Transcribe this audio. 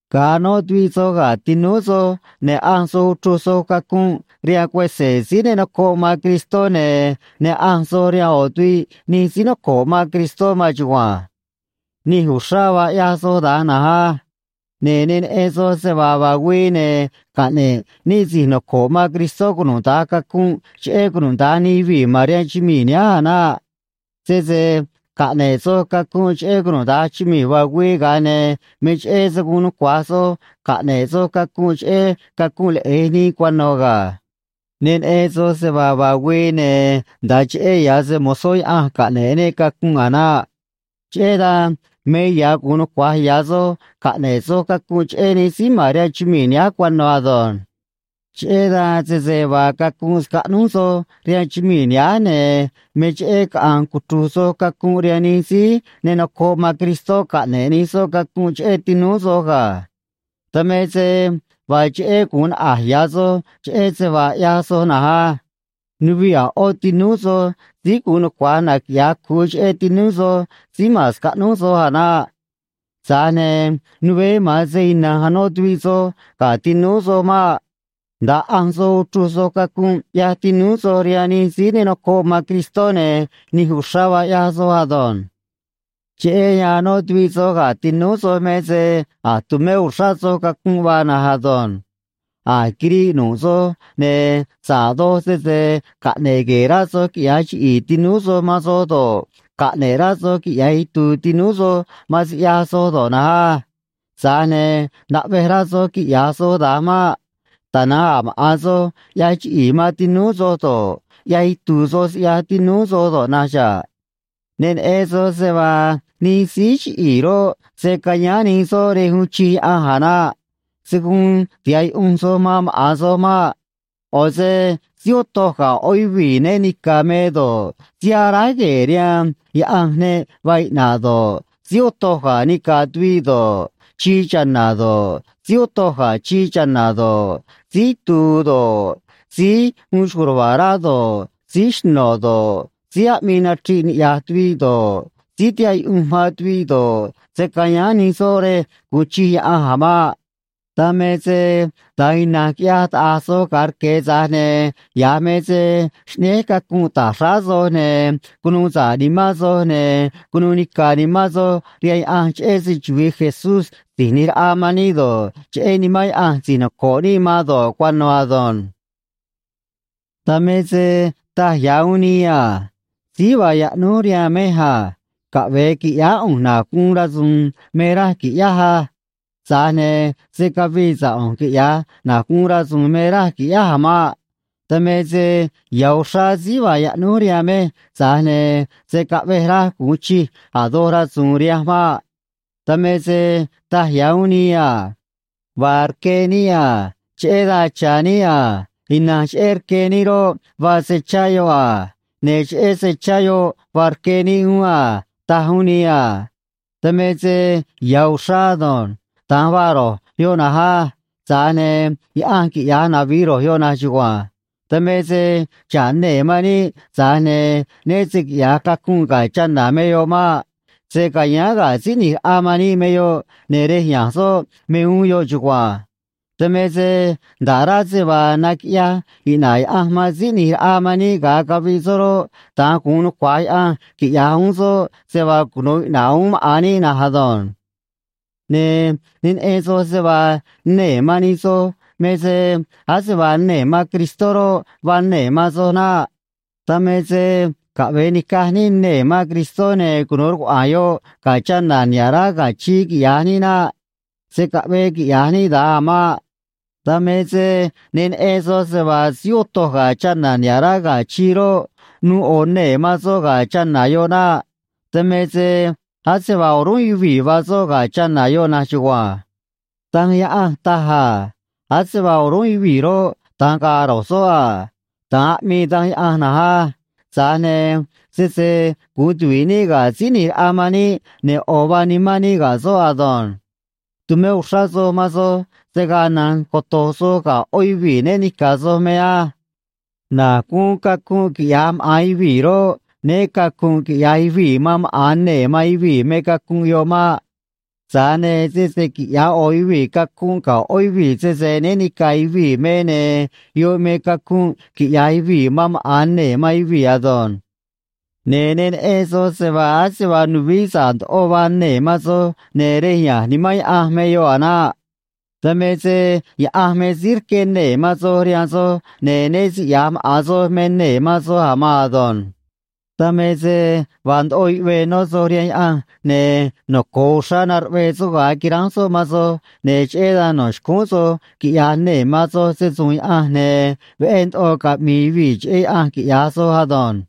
Ga̱a anó tuviꞌ soj ga̱ tinúú soj, ne̱ ꞌanj soj uchruj soj cacunꞌ rihaan cuese̱ síí ne nocoꞌ man Cristó ne̱ ne ꞌanj soj rihaan ꞌo̱ tuviꞌ nij síí noco̱ꞌ man Cristó maan chugua̱nj. Nij uxrá vaa ꞌyaj soj da̱nj na̱nj á. Ne̱ ne neꞌen soj se vaa vaa güii, ne̱ caꞌne̱ꞌ níꞌ si̱j noco̱ꞌ man Cristó cunuda̱nj cacunꞌ cheꞌé cunuda̱nj nij yuvii̱ ma̱n rihaan chumii̱ nihánj a̱ naꞌ. Sese caꞌne̱ꞌ soj cacunꞌ cheꞌé cunuda̱nj chumii̱ vaa güii, ga̱a ne̱ me cheꞌé se̱ guun nucua̱j soj caꞌne̱ꞌ soj cacunꞌ cheꞌé cacunꞌ leꞌe̱j nii cuano̱ ga̱. Ne neꞌen soj se vaa vaa güii, ne̱ nda̱a cheꞌé ya̱ se‑mo̱zó Yaꞌanj caꞌne̱ꞌ níꞌ cacunꞌ a̱ naꞌ. Cheꞌé dan me ya̱ gu̱un nucua̱j ya̱ soj caꞌne̱ꞌ soj cacunꞌ cheꞌé nij síí ma̱n rihaan chumii̱ nihánj cuano̱ ado̱nj. Cheꞌé dan, sese vaa cacunꞌ scaꞌnúj soj rihaan chumii̱ nihánj, ne̱ me cheꞌé caꞌa̱nj cuchru̱j soj cacunꞌ rihaan nij síí ne nocoꞌ man Cristó caꞌne̱ꞌ nij soꞌ cacunꞌ cheꞌé tinúú soj ga̱. Dan me se vaa cheꞌé gu̱un naꞌa̱j ya̱ soj cheꞌé se vaa ꞌyaj soj na̱nj á. Nuviꞌ a̱ ꞌó tinúú soj síí gu̱un nucua̱j naquiꞌya̱j cu̱u cheꞌé tinúú soj síí ma̱n scaꞌnúj soj a̱ naꞌ. Tza̱j ne̱ nuveé, ma̱an se ina̱nj anó tuviꞌ soj ga̱ tinúú soj maꞌ. Nda̱a ꞌanj soj uchruj soj cacunꞌ ꞌyaj tinúú soj rihaan nij síí ne nocoꞌ man Cristó, ne̱ nij uxrá vaa ꞌyaj soj ado̱nj. Cheꞌé yan anó tuviꞌ soj ga̱ tinúú soj me se a̱j tumé uxrá soj cacunꞌ vaa na̱nj ado̱nj. A̱j quiriꞌ nu̱ꞌ soj, ne̱ sa̱ꞌ doj sese caꞌne̱ꞌ gue̱e̱ rá soj quiꞌya̱j chiꞌi̱i̱ tinúú soj man soj do̱ꞌ, caꞌne̱ꞌ rá soj quiꞌya̱j itu̱u̱ tinúú soj man siꞌyaj soj do̱ꞌ na̱nj á. Tza̱j ne̱ naꞌvej rá soj quiꞌya̱j soj da̱nj maꞌ. Tana̱nj a̱ maꞌa̱n soj ꞌyaj chiꞌi̱i̱ man tinúú soj do̱ꞌ, ꞌyaj itu̱u̱ soj siꞌyaj tinúú soj do̱ꞌ na̱nj xa̱ꞌ. Ne neꞌen soj se vaa nij síí chiꞌi̱i̱ roꞌ, se̱ cayáán nij soꞌ rej uun chij Yaꞌanj a̱ naꞌ. Se̱ guun tiha̱ꞌ yuꞌunj soj man maꞌa̱n soj maꞌ. ꞌO̱ se síí otoj ga̱ ꞌó yuvii̱ né ni̱ca̱ me do̱ꞌ, síí aráj gue̱e̱ rihaan yaꞌanj ne vaa iꞌna̱ꞌ do̱ꞌ, síí otoj ga̱ nica̱ tuviꞌ do̱ꞌ, chii cha̱na̱ do̱ꞌ, síí otoj ga̱ chii cha̱na̱ do̱ꞌ, síí itu̱u̱ do̱ꞌ, síí uun xco̱j ruva̱a̱ rá do̱ꞌ, síí xno̱ do̱ꞌ, síí aꞌmii nachriꞌ niꞌya̱j tuviꞌ do̱ꞌ, síí tihaꞌ yuꞌunj man tuviꞌ do̱ꞌ, se̱ cayáán nij soꞌ rej gu̱un chij Yaꞌanj a̱ maꞌ. Dan me se da̱nj ina̱nj quiꞌyaj taꞌa̱j soj ga̱a rque̱, tza̱j ne̱ ya̱j me se xꞌnéj cacunꞌ ta̱j xráá soj, ne̱ cunuu sa̱ꞌ nimán soj, ne̱ cunuu nica̱ nimán soj rihaan Yaꞌanj, cheꞌé se‑chuvi̱i Jesús Si̱j ꞌNi̱j Raꞌa man níꞌ do̱ꞌ, cheꞌé Nimán Yaꞌanj si̱j noco̱ꞌ níꞌ man do̱ꞌ, cuano̱ ado̱nj. Dan me se taj ya̱ uún nii a: “Síí vaa yaꞌnúj rihaan mej a. Caꞌve̱e qui̱ꞌyáá ꞌu̱nj na̱j guun rasu̱u̱n me raj qui̱ꞌyáj á.” Tza̱j ne̱ se̱ cavii sa̱ꞌ ꞌu̱nj, quiꞌya̱j na̱j guun rasu̱u̱n me raj qui̱ꞌyáj a̱ maꞌ. Dan me se ya̱ uxrá síí vaa yaꞌnúj rihaan mej, tza̱j ne̱ se̱ caꞌvej raj gu̱un chij a̱ doj rasu̱u̱n rihanj maꞌ. Dan me se taj ya̱ uún nii a: “Vaa rque níꞌ a. Cheꞌé dan cha̱ níꞌ a. Ina̱nj cheꞌé rque níꞌ roꞌ, vaa se chá yoꞌ a. Ne̱ cheꞌé se chá yoꞌ vaa rque níꞌ uún a”, taj uún nii a. Dan me se ya̱ uxrá ado̱nj. Da̱nj vaa ro̱j yoꞌ na̱nj á. Tza̱j ne̱ Yaꞌanj quiꞌya̱j navi̱j ro̱j yoꞌ na̱nj chugua̱nj. Dan me se xa̱ꞌ nee̱ man níꞌ, tza̱j ne̱ né se quiꞌya̱j cacunꞌ ga̱ chana̱ me yoꞌ maꞌ. Se ca̱yáán ga̱ Síí ꞌNi̱j Raꞌa man níꞌ me yoꞌ, ne̱ rej ya̱nj soꞌ me uún yoꞌ chugua̱nj. Dan me se nda̱ꞌ rá se vaa naquiꞌyaj iꞌna̱ꞌ Yaꞌanj man Síí ꞌNi̱j Raꞌa man níꞌ ga̱a caviꞌ soꞌ roꞌ, da̱nj gu̱un nucua̱j Yaꞌanj quiꞌya̱j uún soꞌ se vaa cunu̱u iꞌna̱ꞌ uún maꞌa̱n níꞌ na̱nj ado̱nj. Ne̱ ne neꞌen soj se vaa nee̱ man nij soj me se ase vaa nee̱ man Cristó roꞌ, vaa nee̱ man soj naꞌ. Dan me se caꞌve̱e ni̱caj níꞌ nee̱ man Cristó, ne̱ cunu̱u rcuaꞌa̱a̱n yoꞌ ga̱ chana̱ niha̱ꞌ rá ga̱ chii, quiꞌya̱j níꞌ naꞌ. Se̱ caꞌvee quiꞌya̱j níꞌ da̱nj a̱ maꞌ. Dan me se ne neꞌen soj se vaa síí otoj ga̱ chana̱ niha̱ꞌ rá ga̱ chii roꞌ, nuu ꞌo̱ nee̱ man soꞌ ga̱ chana̱ yoꞌ naꞌ. Dan me se ase vaa o̱rúnꞌ yuvii̱ vaa soꞌ ga̱ chana̱ yoꞌ na̱nj chugua̱nj. Danj Yaꞌanj taj a: “Ase vaa o̱rúnꞌ yuvii̱ roꞌ, da̱nj ga̱a̱ ro̱j soꞌ a.” Da̱nj aꞌmii Danj Yaꞌanj na̱nj á. Tza̱j ne̱ sese guun tuvi̱ꞌ níꞌ ga̱ Síí ꞌNi̱j Raꞌa man níꞌ, ne̱ ꞌo̱ vaa nimán níꞌ ga̱ soꞌ ado̱nj. Tu̱mé uxrá soj man soj se̱ gaa na̱nj coto̱j soj ga̱ ꞌó yuvii̱ né ni̱ca̱ soj me á. Na̱j guun cacunꞌ quiꞌya̱j maꞌa̱n yuvii̱ roꞌ, né cacu̱nꞌ quiꞌya̱j yuvii̱ man maꞌa̱n nee̱ man yuvii̱ me cacunꞌ yoꞌ maꞌ. Tza̱j ne̱ sese quiꞌya̱j ꞌo̱ yuvii̱ cacunꞌ ga̱ ꞌó yuvii̱ sese né ni̱ca̱ yuvii̱ me, ne̱ yoꞌ me cacunꞌ quiꞌya̱j yuvii̱ man maꞌa̱n nee̱ man yuvii̱ ado̱nj. Ne̱ ne neꞌen soj se vaa ase vaa nuvií sa̱ꞌ ndoꞌo vaa nee̱ man soj, ne̱ rej ya̱nj Nimán Yaꞌanj me yoꞌ a̱ naꞌ. Dan me se Yaꞌanj me síí rqué nee̱ man soj rihaan soj, ne̱ né siꞌya̱j maꞌa̱n soj me nee̱ man soj a̱ maan ado̱nj. Dan me se vaa ndoꞌo yuꞌvee nó soj rihaan Yaꞌanj, ne̱ noco̱o uxrá naruꞌvee soꞌ ga̱a quiránj soꞌ man soj, ne̱ cheꞌé dan no̱ xcúún soj quiꞌya̱j nee̱ man soj se‑su̱u̱n Yaꞌanj, ne̱ veꞌé ndoꞌo caꞌmi̱i̱ yuvii̱ cheꞌé Yaꞌanj, quiꞌya̱j soj ado̱nj.